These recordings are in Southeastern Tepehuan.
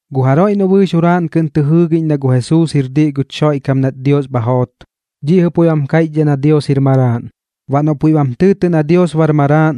Gu jaroiꞌ noꞌ bɨɨx juraaꞌn kɨꞌn tɨ jɨɨgiꞌñ na gu Jesuus jir diꞌ guch Xoiꞌkam nat Dios bha joot, dhiꞌ jɨꞌ puiꞌ bam kaiꞌchdhaꞌ na Dios jir Maraaꞌn. Baꞌ noꞌ puiꞌ bam tɨɨtɨꞌ na Dios bar Maraaꞌn,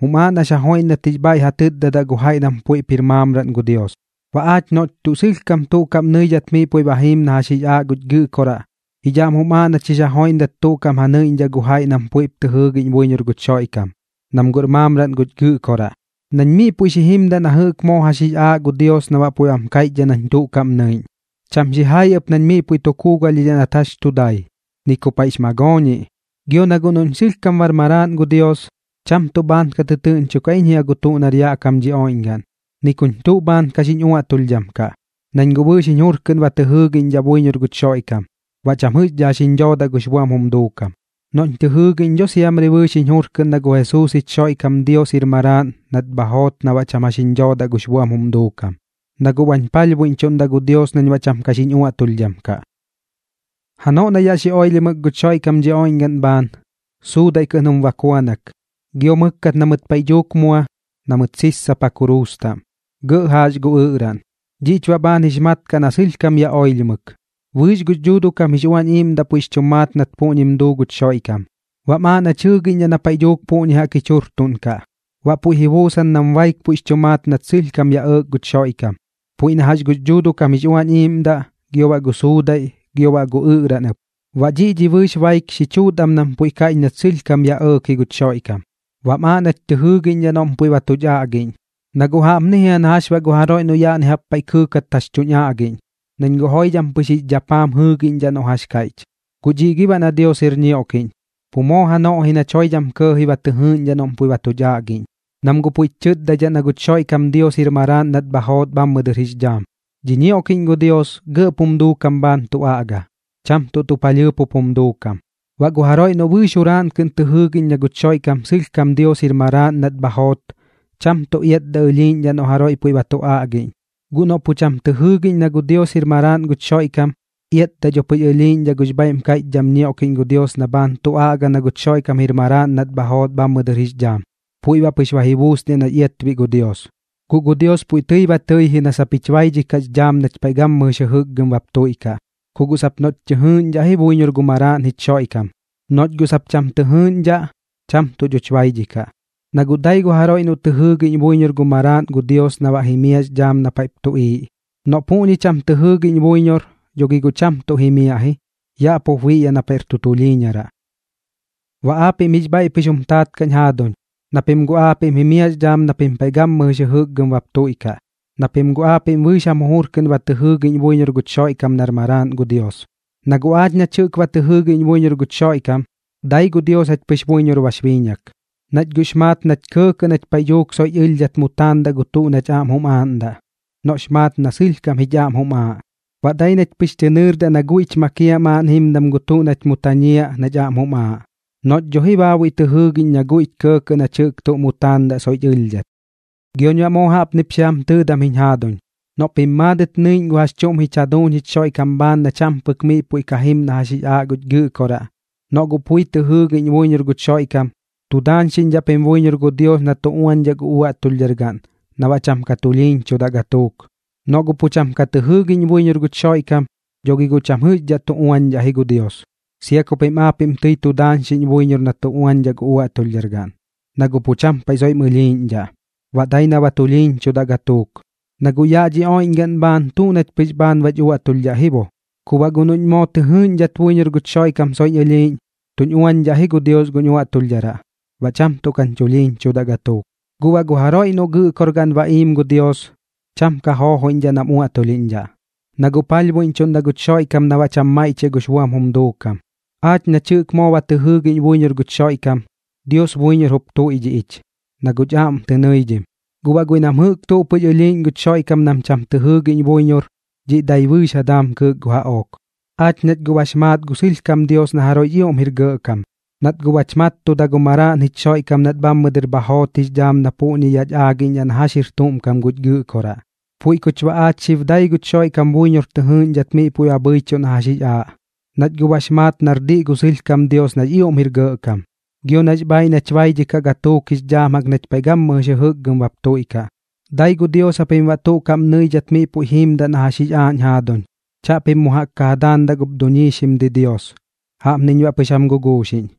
jum aaꞌ nax ja joiꞌndat jix bhaiꞌ ja tɨtdadaꞌ gu jaiꞌ nam puiꞌp jir maamraꞌn gu Dios. Baꞌ aach noꞌch tuꞌ sɨlhkam tuꞌ kaꞌm nɨidhat miꞌ puiꞌ ba jiim na jax jix aaꞌ guch Gɨꞌkoraꞌ, jich aꞌm jum aaꞌ nach jix ja joiꞌndat tuꞌ kaꞌm ja nɨiꞌñdhaꞌ gu jaiꞌ nam puiꞌp tɨ jɨɨgiꞌñ buiñor guch Xoiꞌkam, nam guꞌr maamraꞌn guch Gɨꞌkoraꞌ. Nañ miꞌ puiꞌ xi jimdaꞌ na jɨꞌk moo jax jix aaꞌ gu Dios na baꞌ puiꞌ bam kaiꞌch nañ tuꞌ kaꞌm nɨiꞌñ. Cham xijai ɨp nañ miꞌ puiꞌ tu kuugalhdhidhaꞌ nat jax tu dai, ni ku paiꞌx magooñiꞌ. Gio na guꞌ noꞌñ sɨlhkam bar maraaꞌn gu Dios, cham tuꞌ bhaan ka tɨtɨɨꞌñchokaꞌ iñ jia gu tuꞌ nar yaꞌ kam dhi oiꞌñgaꞌn, ni kuñ tuꞌ bhaan ka xiñ uaꞌtulhdham kaꞌ, nañ guꞌ bɨɨx jiñ jur kɨꞌn ba tɨ jɨɨgiꞌñdhaꞌ buiñor guch Xoiꞌkam, baꞌ cham jɨꞌxdhaꞌ jax jiñ dhoodaꞌ gux buam jum duukam. Noꞌñ tɨ jɨɨgiꞌñ dho siamri bɨɨx jiñ jur kɨꞌn na gu Jesuus jich Xoiꞌkam Dios jir Maraaꞌn nat bha joot na baꞌ cham jax jiñ dhoodaꞌ gux buam jum duukam, na guꞌ bañ palhbuiꞌñchuꞌndaꞌ gu Dios nañ baꞌ cham ka xiñ uaꞌtulhdham kaꞌ. Janoꞌ na yaꞌ xi oilhimɨk guch Xoiꞌkam dhi oiꞌñgaꞌn bhaan, suudaiꞌ kɨꞌn jum bakuanak, gio mɨkkat na mɨt paiꞌ dhuuk mua na mɨt sissapa kuruus taꞌm, gɇꞌ jaax gu ɨꞌraꞌn. Dhiꞌch baꞌ bhaan jix mat kaꞌ na sɨlhkam yaꞌ oilhimɨk. Bɨɨx gux Dhuuduꞌ kam jix Uañ Iiꞌmdaꞌ puiꞌx chu maat nat puꞌñim duu guch Xoiꞌkam, baꞌm aaꞌ nach jɨɨgiꞌñdhaꞌ na paiꞌ dhuuk puꞌñi jaꞌk jich jurtuꞌnkaꞌ. Baꞌ puiꞌ ji buusan nam baik puiꞌx chu maat nat sɨlhkam yaꞌ ɇɇk guch Xoiꞌkam, puiꞌ na jax gux Dhuuduꞌ kam jix Uañ Iiꞌmdaꞌ, gio baꞌ gu suudaiꞌ, gio baꞌ gu ɨꞌraꞌn ɨp. Baꞌ dhiꞌ dhi bɨɨx baik xi chuut am nam puiꞌ kaiꞌch nat sɨlhkam yaꞌ ɇɇk ji guch Xoiꞌkam, baꞌm aaꞌ nach tɨ jɨɨgiꞌñdhaꞌ noꞌm puiꞌ ba tuch aꞌgiꞌñ. Na guꞌ jaꞌpni jia na jax baꞌ gu jaroiꞌ noꞌ yaꞌni jaꞌp paiꞌ kɨɨkat jax tuñ aꞌgiꞌñ, nañ guꞌ joidham pɨx jix dhappaam jɨɨgiꞌñdhaꞌ noꞌ jax kaiꞌch. Guꞌ dhiꞌ gi baꞌ na Dios jir ñioꞌkiꞌñ, pu moo janoꞌ ji nach joidham kɇɇji ba tɨ jɨɨꞌñdhaꞌ noꞌm puiꞌ ba tuch aꞌgiꞌñ, nam guꞌ puiꞌch chɨtdaidhaꞌ na guch Xoiꞌkam Dios jir Maraaꞌn nat bha joot bhammɨ dɨr jix dhaam. Dhi ñioꞌkiꞌñ gu Dios gɇꞌp jum duukam bhaan tu aꞌga, cham tuꞌ tuꞌ palhɨɨp jup jum duukam. Baꞌ gu jaroiꞌ noꞌ bɨɨx juraaꞌn kɨꞌn tɨ jɨɨgiꞌñ na guch Xoiꞌkam sɨlhkam Dios jir Maraaꞌn nat bha joot, cham tuꞌ iatdaꞌ ɨlhiiꞌñdhaꞌ noꞌ jaroiꞌ puiꞌ ba tu aꞌgiꞌñ. Guꞌ noꞌ guꞌ cham tɨ jɨɨgiꞌñ na Dios jir Maraaꞌn guch Xoiꞌkam, iatdaꞌ dho pɨx ɨlhiiꞌñdhaꞌ gux bhaiꞌm kaiꞌchdham ñioꞌkiꞌñ gu Dios na bhaan tu aꞌga na guch Xoiꞌkam jir Maraaꞌn nat bha joot bhammɨ dɨr jix dhaam, puiꞌ baꞌ pɨx ba ji buusniaꞌ nax iatbiꞌ gu Dios. Guꞌ gu Dios puiꞌ tɨi ba tɨi ji na sap jich baidhikaꞌx dhaam nach paiꞌ gammɨjɨx jɨjɨkgɨm bap tuiꞌkaꞌ, ku guꞌ sap noꞌch tɨ jɨɨꞌñdhaꞌ ji buiñor gu Maraaꞌn jich Xoiꞌkam. Noꞌch guꞌ sap cham tɨ jɨɨꞌñdhaꞌ, cham tuꞌ dhoch baidhikaꞌ. Na guꞌ dai gu jaroiꞌ noꞌ tɨ jɨɨgiꞌñ buiñor gu Maraaꞌn gu Dios na baꞌ jimiaꞌx dhaam na paiꞌp tuꞌiiꞌ. Noꞌ guꞌ puꞌñi cham tɨ jɨɨgiꞌñ buiñor, dho gi guꞌ cham tuꞌ jimiaꞌ ji, yaꞌ pup biꞌyaꞌ na paiꞌr tu tulhiiñaraꞌ. Baꞌ aapiꞌm jix bhaiꞌ pɨx jum taat kaꞌñ jaaduñ, na pim guꞌ aapiꞌm jimiaꞌx dhaam na pim paiꞌ gammɨjɨx jɨjɨkgɨm bap tuiꞌkaꞌ, na pim guꞌ aapiꞌm bɨɨx jam jujur kɨꞌn ba tɨ jɨɨgiꞌñ buiñor guch Xoiꞌkam nar Maraaꞌn gu Dios. Na guꞌ aach nach jɨꞌk ba tɨ jɨɨgiꞌñ buiñor guch Xoiꞌkam, dai gu Dios jach pɨx buiñor bax biiñak, nach guꞌx maat nach kɇɇkɇꞌ nach paiꞌ dhuuk soiꞌch ɨlhdhat mu taandaꞌ gu tuꞌ nach aꞌm jum aaꞌndaꞌ, noꞌx maat na sɨlhkam jich aꞌm jum aaꞌ. Baꞌ dai nach pɨx tɨ nɨɨrdaꞌ na guiꞌch makiaꞌ maaꞌn jimdam gu tuꞌ nach mu tañiaꞌ nach aꞌm jum aaꞌ, noꞌch dho ji baabuiꞌ tɨ jɨɨgiꞌñ na guiꞌch kɇɇkɇꞌ nach jɨꞌk tuꞌ mu taandaꞌ soiꞌch ɨlhdhat. Gioñ baꞌ moo jaꞌpnip xi jam tɨɨdam jiñ jaaduñ, noꞌ pim maadɨt nɨiꞌñ gu jax chuꞌm jich jaduuñ jich Xoiꞌkam bhaan na cham pɨk miꞌ puiꞌ jim na jax jix aaꞌ guch Gɨꞌkoraꞌ, noꞌ guꞌ pui tɨ jɨɨgiꞌñ buiñor guch Xoiꞌkam, tu daañxiꞌñdhaꞌ pim buiñor gu Dios na tu uañdhaꞌ gu uaꞌtulhdhargaꞌn na baꞌ cham ka tulhiiñchudaꞌ gatuuk. Noꞌ guꞌ pu cham ka tɨ jɨɨgiꞌñ buiñor guch Xoiꞌkam, dho gi guꞌ cham jɨꞌxdhaꞌ tu uañdhaꞌ ji gu Dios, sia ku pim aapiꞌm tɨi tu daañxiꞌñ buiñor na tu uañdhaꞌ gu uaꞌtulhdhargaꞌn, na guꞌ pu cham paiꞌ soiꞌm ɨlhiiꞌñdhaꞌ, baꞌ dai na ba tulhiiñchudaꞌ gatuuk. Na guꞌ yaꞌ dhi oiꞌñgaꞌn bhaan, tuꞌ nach pɨx bhaan bach uaꞌtulhdhaꞌ ji bo, ku baꞌ guꞌ noꞌñ moo tɨ jɨɨꞌñdhat buiñor guch Xoiꞌkam soiꞌñ ɨlhiiꞌñ, tuñ uañdhaꞌ ji gu Dios guñ uaꞌtulhdharaꞌ, baꞌ cham tuꞌ kañ chulhiiñchudaꞌ gatuuk. Guꞌ baꞌ gu jaroiꞌ noꞌ Gɨꞌkorgaꞌn ba iim gu Dios, cham ka joojoiꞌñdhaꞌ nam uaꞌtulhiꞌñdhaꞌ, na guꞌ palhbuiꞌñchuꞌndaꞌ guch Xoiꞌkam na baꞌ cham maiꞌchiaꞌ gux buam jum duukam. Aach nach jɨꞌk moo ba tɨ jɨɨgiꞌñ buiñor guch Xoiꞌkam, Dios buiñor jup tuiꞌdhiꞌ ich, na guꞌch aꞌm tɨ nɨidhim. Guꞌ baꞌ guiꞌ nam jɨꞌk tuꞌ pɨx ɨlhiiꞌñ guch Xoiꞌkam nam cham tɨ jɨɨgiꞌñ buiñor, dhiꞌ dai bɨɨx ja daam kɨɨk gu jaꞌook. Aach nach guꞌ bax maat gu sɨlhkam Dios na jaroiꞌx ioꞌm jir gɇꞌkam, nat guꞌ bach mattuda gu Maraaꞌn jich Xoiꞌkam nat bhammɨ dɨr bha joot jix dhaam na puꞌñi yaꞌch aagiꞌñdhaꞌ na jax jir tuꞌm kam guch Gɨꞌkoraꞌ. Puiꞌ kuch baꞌ aach xib dai guch Xoiꞌkam buiñor tɨ jɨɨꞌñdhat miꞌ puiꞌ bhɨichuꞌ na jax jix aaꞌ, nach guꞌ bax maat nar diꞌ gu sɨlhkam Dios nax ioꞌm jir gɇꞌkam, gio nax bhaaiꞌ nach baidhikaꞌ gatuuk jix dhaam jaꞌk nach paiꞌ gammɨjɨx jɨjɨkgɨm bap tuiꞌkaꞌ. Dai gu Dios japim baꞌ tuꞌ kaꞌm nɨidhat miꞌ puiꞌ jiimdaꞌ na jax jix aaꞌ jiñ jaaduñ. Chaꞌpim mu jaꞌk ja daandaꞌ gup duñiixim didios. Jaꞌpniñ baꞌ pɨx jam guguuxiꞌñ.